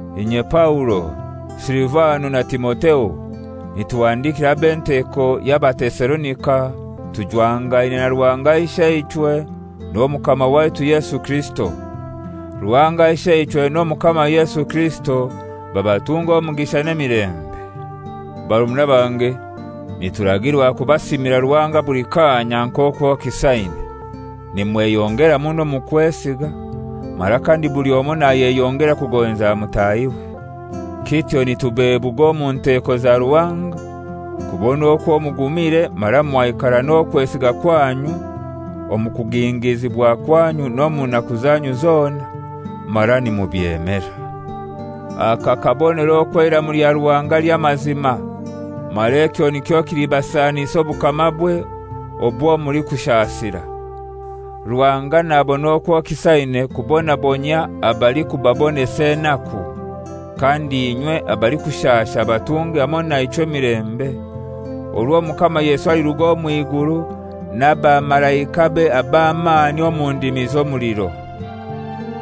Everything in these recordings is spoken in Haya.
Inye Paulo, Silivano na Timotheo, nituhandikira ab'enteko y'Abatesalonika tujwangaine na Ruhanga Isheichwe n'Omukama waitu Yesu Kirisito. Ruhanga Isheichwe n'Omukama Yesu Kirisito babatunge omugisha n'emilembe. Barumuna bange nituragirwa kubasiimira Ruhanga buli kanya, nk'okwo kisaine, nimweyongera muno omu kwesiga, mara kandi buli omoi nayeyongera kugonza mutahiwe. Kityo nitubebuga omu nteko za Ruhanga kubona okwo mugumire mara mwaikara n'okwesiga kwanyu omu kugingizibwa kwanyu n'omu naku zanyu zona mara nimubyemera. Aka kabonero okwo eiramu lya Ruhanga ly'amazima mara ekyo nikyo kilibasanisa obukamabwe obwo mulikushasira. Ruhanga nabona okwo kisaine kubonabonyia abalikubabonesa enaku, kandi inywe abalikushasha abatunge hamoi naichwe emilembe orwo Omukama Yesu aliruga omw'iguru n'abamalaikabe ab'amani omu ndimi z'omuliro.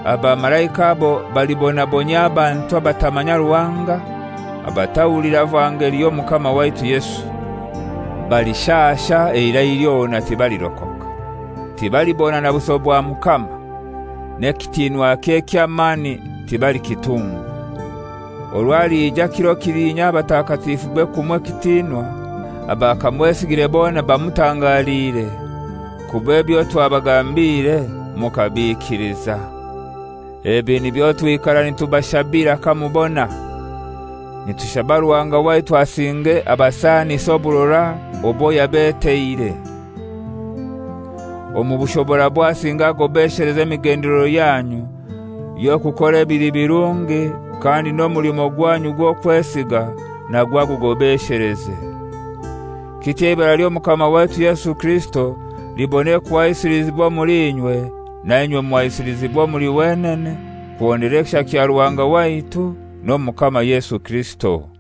Abamalaika abo balibonabonyia abantu abatamanya Ruhanga, abatahulira vangeli y'Omukama waitu Yesu. Balishasha eirai lyona tibalirokoka, tibalibona na buso bwa Mukama, n'ekitinwakye eky'amani tibalikitungwa, orwo alija kiro kilinya abatakatifube kumuha ekitinwa, abakamwesigire bona bamutangaliire, kuba ebyo twabagambiire mukabiikiliza. Ebi nibyo twikara nitubashabira kamubona. Nitushaba Ruhanga waitu asinge abasaanise oburora obwo yabeteire. Omu bushoborabwe asinge agobesheleze emigendelero yanyu y'okukora ebili birungi kandi n'omulimo gwanyu gw'okwesiga nagwo agugobesheleze. Kityo eibara ly'Omukama waitu Yesu Kirisito libone kuhaisilizibwa omuli inywe, nainywe muhaisilizibwe omuli wenene kuhondera ekisha kya Ruhanga waitu n'Omukama Yesu Kirisito.